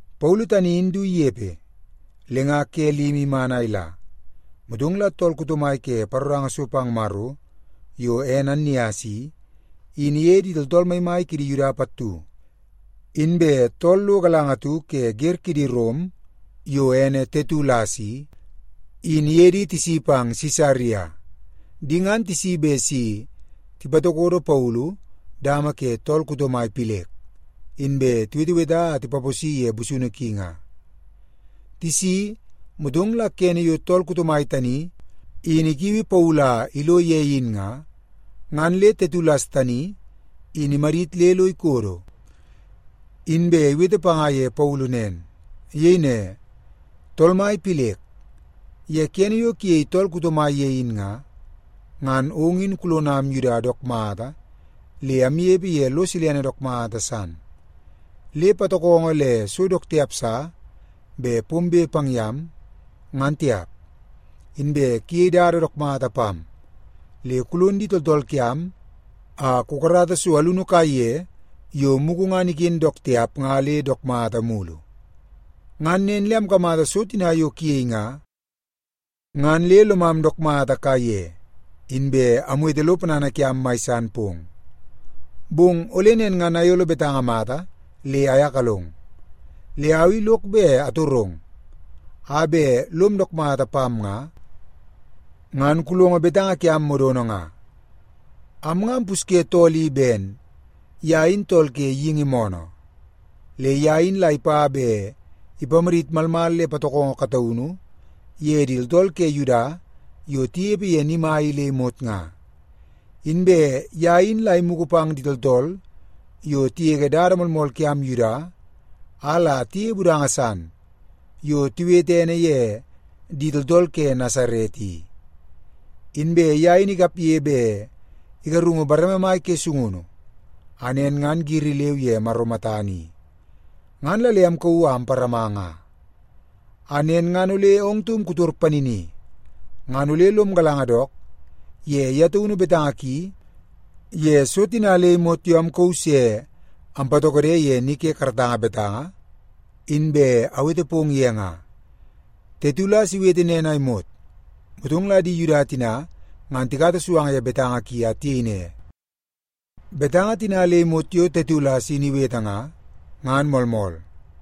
Paulu tani in du inepe, le nga ke limi iman a ila, motong la tool kuto mai ke paroranga so pang Maro yo ene Annias i, in iye di tooltool maimai kidi Yuda pattu, inbe tool lo galanga atu ke wer kidi Rom yo ene Tetulas i, in iye di tisi pang Sisaria. Di ngan tisi bet si tipatokodo Paulu dama ke tool kuto mai Pilek, inbe tiweteweta a tipaposi ye busunu ki nga. Tisi, motong la kene yo tool kuto mai tani in ikiui Paulu a ilo ye in nga, ngan le Tetulas tani in imadit le lo ikodo, inbe iwete panga ye Paulu nen. Iyei ne, “Tool mai Pilek, ye kene yo kuyei tool kuto mai ye in nga, ngan ong in kulonam Yuda dook mata le amnepe ye lo silene dook mata san, le patokongo le so dook tiap sa bet pombe pang yam, ngan tiap. Inbe kuyei dada dook mata pam, le kulon di tooltool kiam a kukarata so alunu kaiye yo mugu ngan iken dook tiap nga le dook mata mulu. Ngan nen le amkamata so tina yo kuyei nga, ngan le lomam dook mata kaiye, inbe amwete lo ponana kiam mai san pong. Bong ole nen ngan ayolo betanga mata le ayakalong. Le au i lok bet atorong a bet lom dook mata pam nga, ngan kulongo betanga kiam modono nga. “Am nga ampusye tool i ben ye in tool ke geingi moonoo. Le ye in la ipa bet ipamadit malmal le patokongo kataunu ye di tooltool ke Yuda yo tinepe ye ni mai i le imot nga. Inbe ye in la imugu pang di tooltool yo tigege dada moolmool kiam Yuda a la tiyeie budanga san yo tiwete ene ye di Tooltool ke Nasaret i. Inbe ye in ikapge bet igarungu bareme mai ke sungunu, a nen ngan giri leu ye Maro matana i, ngan la le amkauu a amparama nga. A nen ngan ole ong taum kutor panini, ngan ole lom galanga dook ye ye taunu betanga ki ye so tina le imot yo amkauu se ampatokode ye ni ke karatanga betanga, inbe awete pong ye nga.” Tetulas iwete nen a imot, motong la di Yuda tina ngan tikata suanga ye betanga ki a tiyei ne, “Betanga tina le imot yo Tetulas in iwete nga, ngan moolmool.”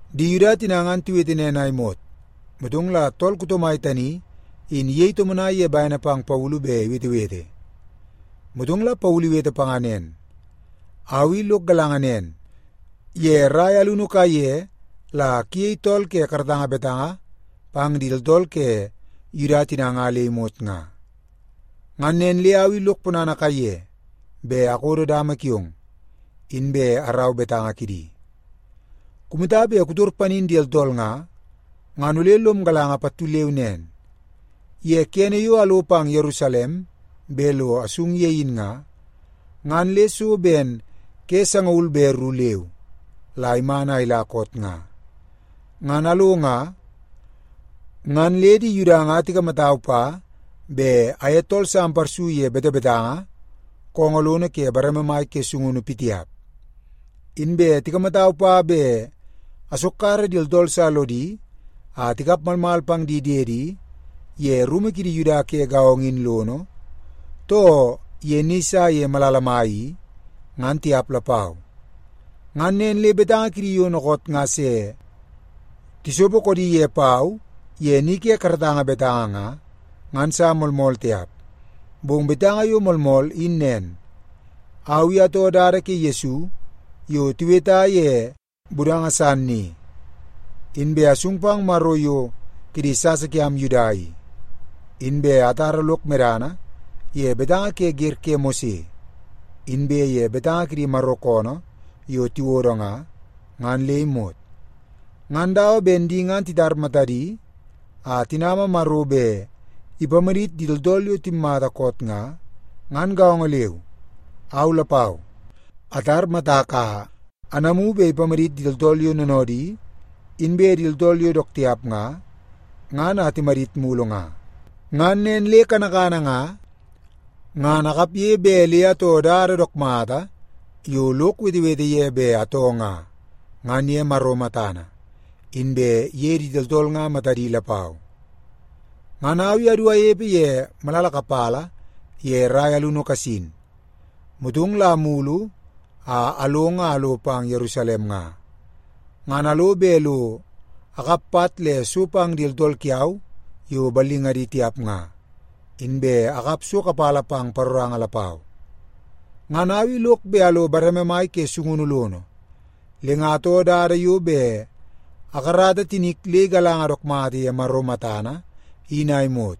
Di Yuda tina ngan tiwete nen a imot, motong la tool kuto mai tani in iyei tomonai ye bene pang Paulu bet iwetewete. Motong la Paulu iwete panga nen, “Au i lok galanga nen, ye rai alunu kaiye la kuyei tool ke karatanga betanga pang di tooltool ke Yuda tina nga le imot nga. Ngan nen le au i lok ponana kaiye bet akodo dama kiong, inbe arau betanga kidi. Kumata bet kutor panin di tooltool nga, ngan ole lom galanga pattu leu nen. Ye kene yo alo pang Yerusalem bet lo asung ye in nga, ngan le so ben ke sangaul be ru leu la iman a ila koot nga. Ngan alo nga, ngan le di Yuda nga tikamatau pa bet aye tool sa amparsu ye betebetanga koongoo lono ke bareme mai ke sungunu pitiap. Inbe tikamatau pa bet asokkara di tooltool sa lodi a tikap malmal pang di diedi ye rumu kidi Yuda ke gaongo in lono, too ye ni sa ye malala mai ni, ngan tiap lapau. Ngan nen le betanga kidi yo dookoot nga se tisopo koodi ye pau ye ni ke karatanga betanga nga, ngan sa moolmool tiap. Bong betanga yo moolmool in nen. Au i atoo Dada ke Yesu yo tiweta ye budanga san i. Inbe asung pang Maro yo kidi sasa kiam Yuda i, inbe atara lok medana ye betanga ke wer ke Mose, inbe ye betanga kidi Maro koonoo yo tiwodo nga, ngan le imot. Ngan dawa ben di ngan titar matadi a tinama Maro bet ipamadit di tooltool yo timmata koot nga, ngan gaongo leu, au lapau atar matak a anamu bet ipamadit di tooltool yo noonoodi inbe di tooltool yo dook tiap nga, ngan a timadit mulu nga. Ngan nen le kanakana nga, ngan akapge bet le atoo dada dook mata yo lok wetewete ye bet atoo nga, ngan ye Maro matana, inbe ye di tooltool nga matadi lapau. “Ngan au i adu anepe ye malala kapala ye rai alunu kasin, motong la amulu a along a alo pang Yerusalem nga, ngan alo bet lo akap pat le so pang di tooltool kiau yo ballingadi tiap nga, inbe akap so kapala pang paroranga lapau. Ngan au i lok bet alo bareme mai ke sungunu lono, le nga atoo dada yo bet akarata tinik le igalanga dook mata ye Maro matana in a imot,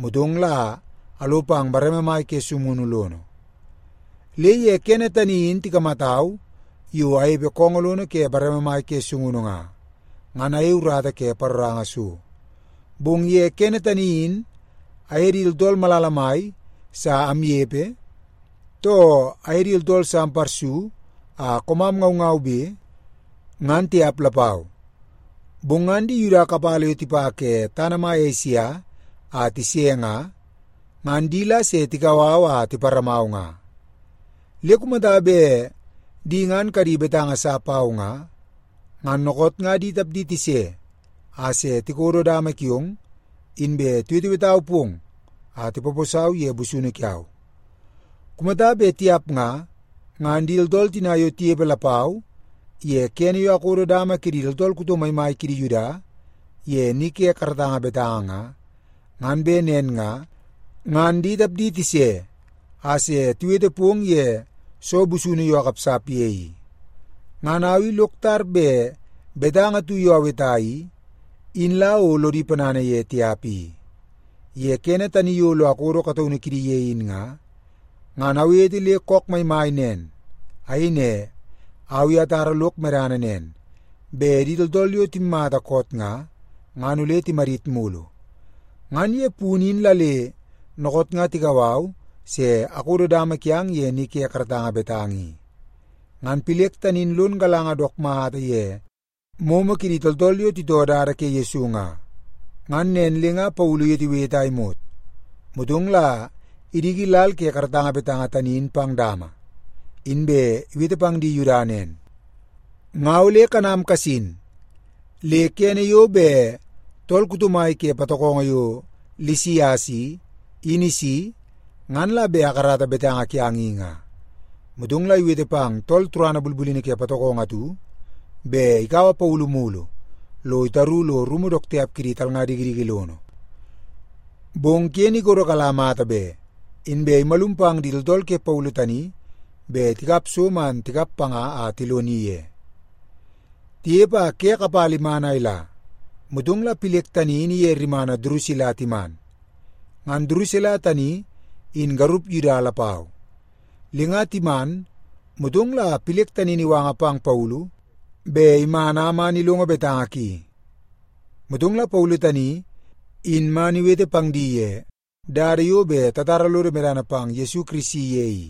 motong la alo pang bareme mai ke sungunu lono. Le ye kene tani in tikamatau yo anepe koongoo lono ke bareme mai ke sungunu nga, ngan ayei urata ke paroranga so. Bong ye kene tani in aye di tooltool malala mai sa amnepe, too aye di tooltool sa amparsu a koomam ngaungaube, ngan tiap lapau. Bong ngan di Yuda kapala yo tipa ke tana mai Esia a tise nga, ngan di la se tikau au a tiparamau nga. Le kumata bet di ngan kadi betanga sa pau nga, ngan dookoot nga di tapdi tise a se tikodo dama kiong, inbe tiwetewetau pong a tipaposau ye busunu kiau. Kumata bet tiap nga, ngan di tooltool tina yo tinepe lapau ye kene yo akodo dama kidi tooltool kuto maimai kidi Yuda ye ni ke karatanga betanga nga, ngan bet nen nga, ngan di tapdi tise a se tiwete pong ye soo busunu yo akapsap ye i. Ngan au i lok tar bet betanga atu yo aweta i, in la o lodi ponana ye tiap i. Ye kene tani yo lo akodo kataunu kidi ye in nga, ngan awete le kook maimai nen. Ayei ne, ‘Au i atara lok medana nen, bet di tooltool yo timmata koot nga, ngan ole timadit mulu. Ngan ye punu in la le dookoot nga tikau au se akodo dama kiang ye ni ke karatanga betanga i.’” Ngan Pilek tani in lon galanga dook mata ye moomoo kidi tooltool yo titoo Dada ke Yesu nga. Ngan nen le nga Paulu iwetewete a imot, motong la idiki lal ke karatanga betanga tani in pang dama, inbe iwete pang di Yuda nen, “Nga ole kanam kasin, le kene yo bet tool kuto mai ke patokongo yo Lisias i, in isi, ngan la bet akarata betanga kiang i nga.” Motong la iwete pang tool turana bulbulini ke patokongo atu bet ikaua Paulu mulu lo itaru lo rumu dook tiap kidi talnga dikidiki lono. Bong ken ikodo kala mata be, inbe imalum pang di tooltool ke Paulu tani bet tikap so man tikap panga a tiloni ye. Tinepe a ke kapala iman a ila, motong la Pilek tani in iye rimana Durusila timan. Ngan Durusila tani in garup Yuda lapau. Le nga timan, motong la Pilek tani in iwanga pang Paulu bet iman a man ilongo betanga ki. Motong la Paulu tani in man iwete pang di ye dada yo bet tatara lodo medana pang Yesu Kirisi ye i.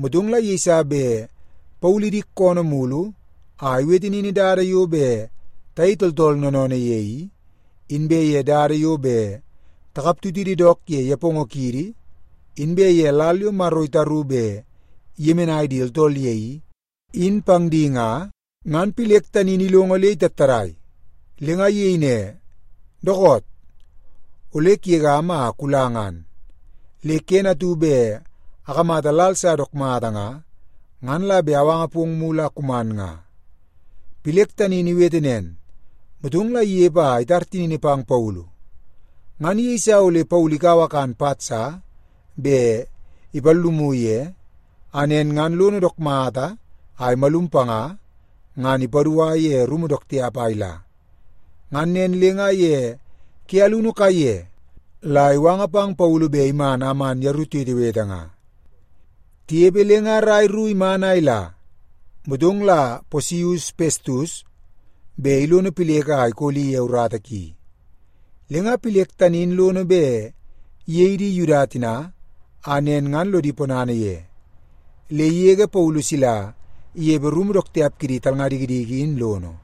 Motong la yeiso bet Paulu idik koonoo mulu a iwete nin dada yo bet tayei tool noonoonoo ye i, inbe ye dada yo bet takaptutidi dook ye nepongo kiidi, inbe ye lal yo Maro itaru bet iyemenai di tooltool ye i, in pang di nga, ngan Pilek tani in ilongo le itattadai. Le nga iyei ne, “Dookoot! Ole kugegam a kula ngan. Le kene atu bet akamata lal sa dook mata nga, ngan la bet awanga pong mulu a kuman nga.” Pilek tani in iwete nen, motong la inepe a itar tinini pang Paulu. Ngan iyeisa ole Paulu ikaua kan pat sa bet ipallumu ye, a nen ngan lono dook mata a imalum panga, ngan ipadua ye rumu dook tiap a ila. Ngan nen le nga ye ke alunu kaiye la iwanga pang Paulu bet iman a man yeru tiwetewete nga. Tinepe le nga rai ru iman a ila, motong la Posius Pestus bet ilono Pilek a ikoli ye urata ki. Le nga Pilek tani in lono bet iyei di Yuda tina a nen ngan lodi ponana ye, le igege Paulu sila inepe rumu dook tiap kidi talnga dikidiki in lono.